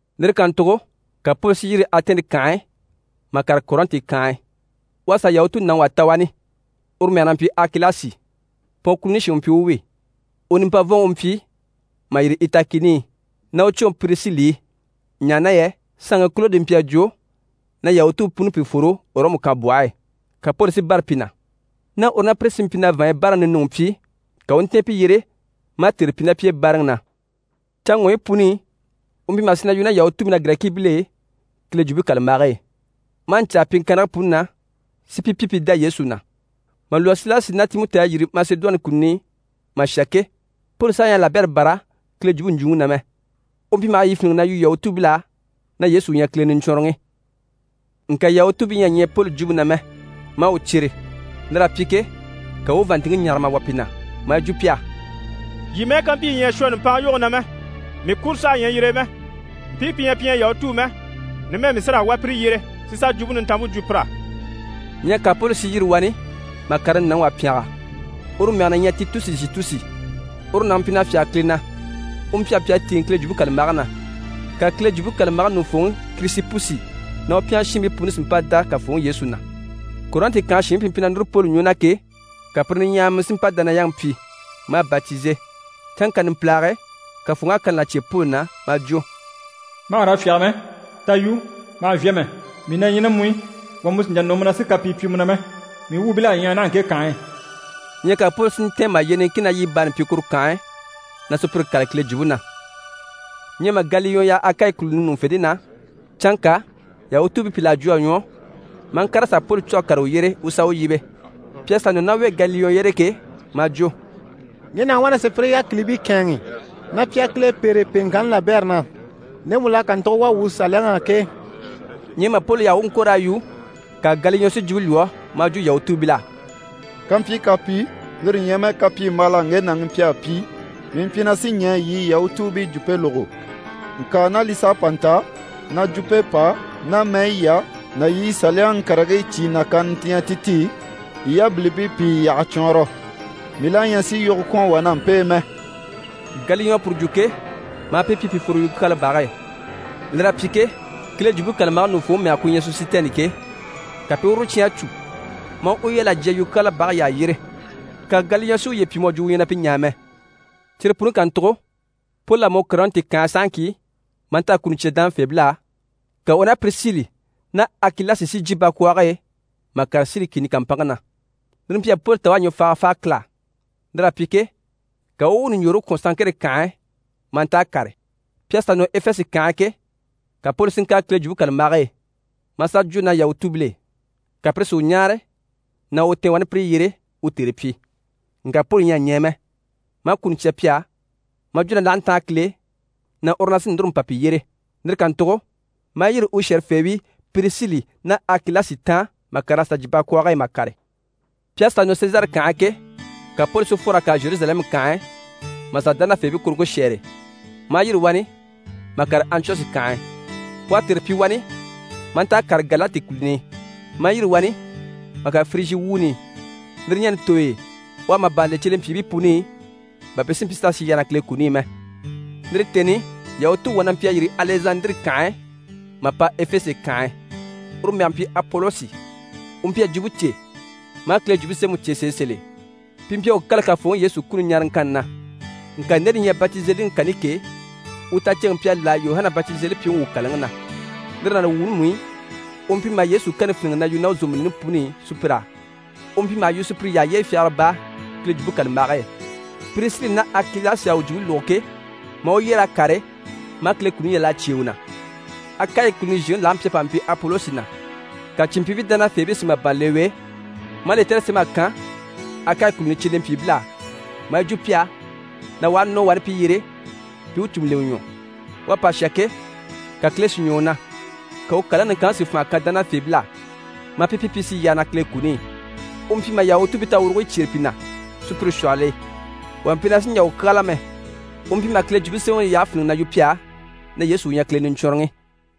Lire kàntugo Poli à yîri Atɛni kànhe e, mà kàre Kɔrɛnti kànhe e. U à sà Yahutu nàŋi wà ta wani, uru mɛge na mpyi Akilasi. Pɔn kùluni shin u mpyi u wi. U nimpavɔnŋi u mpyi mà yîri Itali kìni i ná u cwoŋi Pirisili i, ɲaha na yɛ saanŋi Kolodi mpyi a jwo na Yahutuubii puni pi fworo Ɔrɔmu kànbwɔhe e. Ka Poli si bâra pi na. Ná u ná pire sí mpyi na vàanɲyi bayi báaraŋi ninuŋi pyi, ka u u ntɛ̀ɛn pi yyére maa tère pyi ná pi e báaraŋi na. Canŋɔɲyi puni i, u mpyi maha sì na yu ná Yahutuubii ná Girɛkiibil'e Kile Jwumpe kàlambage e, maa ɲcaa pyiŋkannigii puni na, si pi pyi pi dá Yesu na. Mà lwɔ́ Silasi ná Timɔti à yîri Masedoni kùluni i mà shà ke, Poli saha ɲyɛ a labɛrɛ bâra Kile jwumpe ɲjwuŋi na mɛ. U mpyi maha yi fíniŋi na yu Yahutuubil'á na Yesu u ɲyɛ Kile Niɲcwɔnrɔŋi. Ŋka Yahutuubii ɲyɛ a ɲɛɛ Poli jwumpe na mɛ, maa u cyere. Lir'à pyi ke, ka u u u vàanntinŋke ɲâhara mà wà pi na, maa yi jwo pi á: «Yii mɛ́ɛ ká mpyi yii ɲyɛ a shwɔ nùmpanŋa yoge na mɛ, mii kuro saha ɲyɛ yire e mɛ. Mpii pi ɲyɛ pi ɲyɛ Yahutuu mɛ, numɛ mii sí raa wá pire yyére si sà Jwumpe Nintanmpe jwo pir'á.» Ɲyɛ ka Poli si yîri wani mà kàre nàŋi wà pyɛngɛ, uru mɛge na ɲyɛ Titusi Zhutusi. Uru nàŋi mpyi na fyáge Kile na, u pyɛnge mpyi a tíiŋɛ Kile Jwumpe kàlambage na. Ka Kile Jwumpe kàlambage ɲùŋufooŋi Kirisipusi ná u pyɛngɛ shiinbii puni si mpa dá Kafooŋi Yesu na. Kɔrɛnti kànhe shiinbii pi mpyi na núru Poli ɲwɔ na ke, ka pire niɲyahamii si mpa dániyaŋi pyi, maa batize. Canŋka numpilage e, Kafooŋi à kani là cyêe Poli na maa jwo: «Ma hà raa fyáge mɛ, ta yu, ma hà vyâha mɛ, mii na ɲyɛ ná mu i, wà mú sì n‑jà nɔ mu na si kapii pyi mu na mɛ, mii wuubil'à ɲyaha naha ŋke kànhe e.» Ɲyɛ ka Poli si ntɛ̀ɛn mà yyee niŋkin ná yiɲye baani pyi wani kuru kànhe e na sùpyire kâlali Kile jwumpe na. Ɲyɛ mà Galiyɔn yaha Akayi kùluni ɲùŋufente na, canŋka Yahutuubii pìl'à jwo a ɲwɔ, maa ŋkàr'a sà Poli cû a kàre u yyére, u u sà u yíbe. Pi à sà nɔ ná u e Galiyɔn yyére ke, maa jwo: «Ŋge nàŋi wá na sùpyire yákilibii kɛ̂ɛnŋi na pi a Kile pêre pyiŋkanni labɛrɛ na, ndemu l'à kàntugo wà wuu Saliyaŋi á ke.» Ɲyɛ mà Poli yaha u u ŋko raa yu, ka Galiyɔn si jwumpe lwɔ́ maa jwo Yahutuubil'á: «Kampyi kapii, lire ɲyɛ mɛ kapyimbaala ŋge nàŋi mpyi a pyi, mii mpyi na sí ɲɛɛ yii Yahutuubii jwumpe lógo. Ŋka ná li s'à pa nta na jwumpe pà ná mɛyi yà ná yii Saliyaŋi karigii cyìi nàkaana ti ɲyɛ ti ti, yii yabilimpii pi yi yyaha cwɔɔnrɔ. Mii la ɲyɛ sì yogo kwɔ̀n wà ná mpe e mɛ.» Galiyɔn à puru jwo ke, maa pi pyi pi fworo yukyaala bage e. Lir'à pyi ke, Kile Jwumpe kàlambage ɲùŋufooŋi mɛge ku ɲyɛ Sɔsitɛni ke, ka pi i uru cyán a cû, maa u yal'a jya yukyaala bage yyaha yyére, ka Galiyɔn si uye pyi mu à jwo u ɲyɛ na pi ɲaa mɛ. Cyire puni kàntugo, Poli à mɔ Kɔrɛnti kànhe e sahaŋki maa nta a kuni cya dánafeebil'á, ka u ná Pirisili ná Akilasi si jyè bakwɔɔge e mà kàre Siri kìni kàmpanŋke na. Lire mpyi a Poli ta u à ɲwɔfaaga fáa Kile á, lir'à pyi ke, ka u u u ɲùɲjoore kwɔ̀n Sanŋkere kànhe e maa nta a kàre. Pi à sà nɔ Efese kànhe e ke, ka Poli si ŋkàre Kile Jwumpe kàlambage e, maa sà jwo ná Yahutuubil'e. Ka pire si u ɲáare na u tɛ̀ɛn wani pire yyére u tère pyi, ŋka Poli ɲyɛ a ɲɛɛ mɛ, maa kuni cya pi á, maa jwo na l'aha ntáan Kile e, na uru na sí núru n‑pa pi yyére. Lire kàntugo maa yîri u shɛ̀rɛfeebii Pirisili ná Akilasi taan maa ŋkàr'a sà jyè bakwɔɔge e mà kàre. Pi à sà nɔ Sezare kànhe e ke, ka Poli si fwor'a kàre Zheruzalɛmu kànhe e mà sà dánafeebii kuruŋke shɛ́ɛre, maa yîri wani mà kàre Antiyɔshi kànhe e. U à tère pyi wani maa nta a kàre Galati kùluni i, maa yîri wani mà kàre Firijyi wuuni i. Lire ɲani tooy'e, u à màban le cyelempyiibii puni i, bà pi si mpyi s'a sì yyaha na Kile kuni i mɛ. Lire tèni i, Yahutuŋi wà na mpyi a yîri Alɛzandire kànhe e mà pa Efese kànhe e, uru mɛge mpyi Apolosi, u mpyi a jwumpe cè, maa Kile Jwumpe Semɛŋi cè sèe sèl'e. Pi mpyi a u kâla Kafooŋi Yesu kuni ɲaaraŋkanni na, ŋka nde li ɲyɛ batizeliŋi kani ke, u taceŋke mpyi a láha Yuhana Batizelipyiŋi u kàlaŋi na. Lire ná li wuuni mú i, u mpyi maha Yesu kani fíniŋi na yu ná u zòmbilini puni i sùpyir'á. U mpyi maha yu sùpyire yyaha yyére fyagara baa Kile Jwumpe kàlambage e. Pirisili ná Akilasi à u jwumpe lógo ke, maa u yyer'a kàre, maa Kile kuni yal'a cyêe u na. Akayi kùluni zhèŋi lage mpyi a pa mpyi Apolosi na, ka cìnmpyiibii dánafeebii si màban le u e, maa lɛtɛrɛ sém'a kan Akayi kùluni cyelempyiibil'á, maa yi jwo pi á na u aha nɔ wani pi yyére, pi i u cùmu lemɛ ɲwɔ. U à pa shà ke, ka Kile si ɲwɔ u na, ka u kàlaŋi niŋkanŋi si fànha kan dánafeebil'á, maa pi pyi pi i sì yyaha na Kile kuni i. U mpyi maha Yahutuubii tawurugoyi cyêre pi na sùpyire shwɔhɔl'e. Wà mpyi na sì n‑jà u kyáala mɛ. U mpyi maha Kile Jwumpe Semɛŋi yyahe fíniŋi na yu pi á na Yesu u ɲyɛ Kile Niɲcwɔnrɔŋi.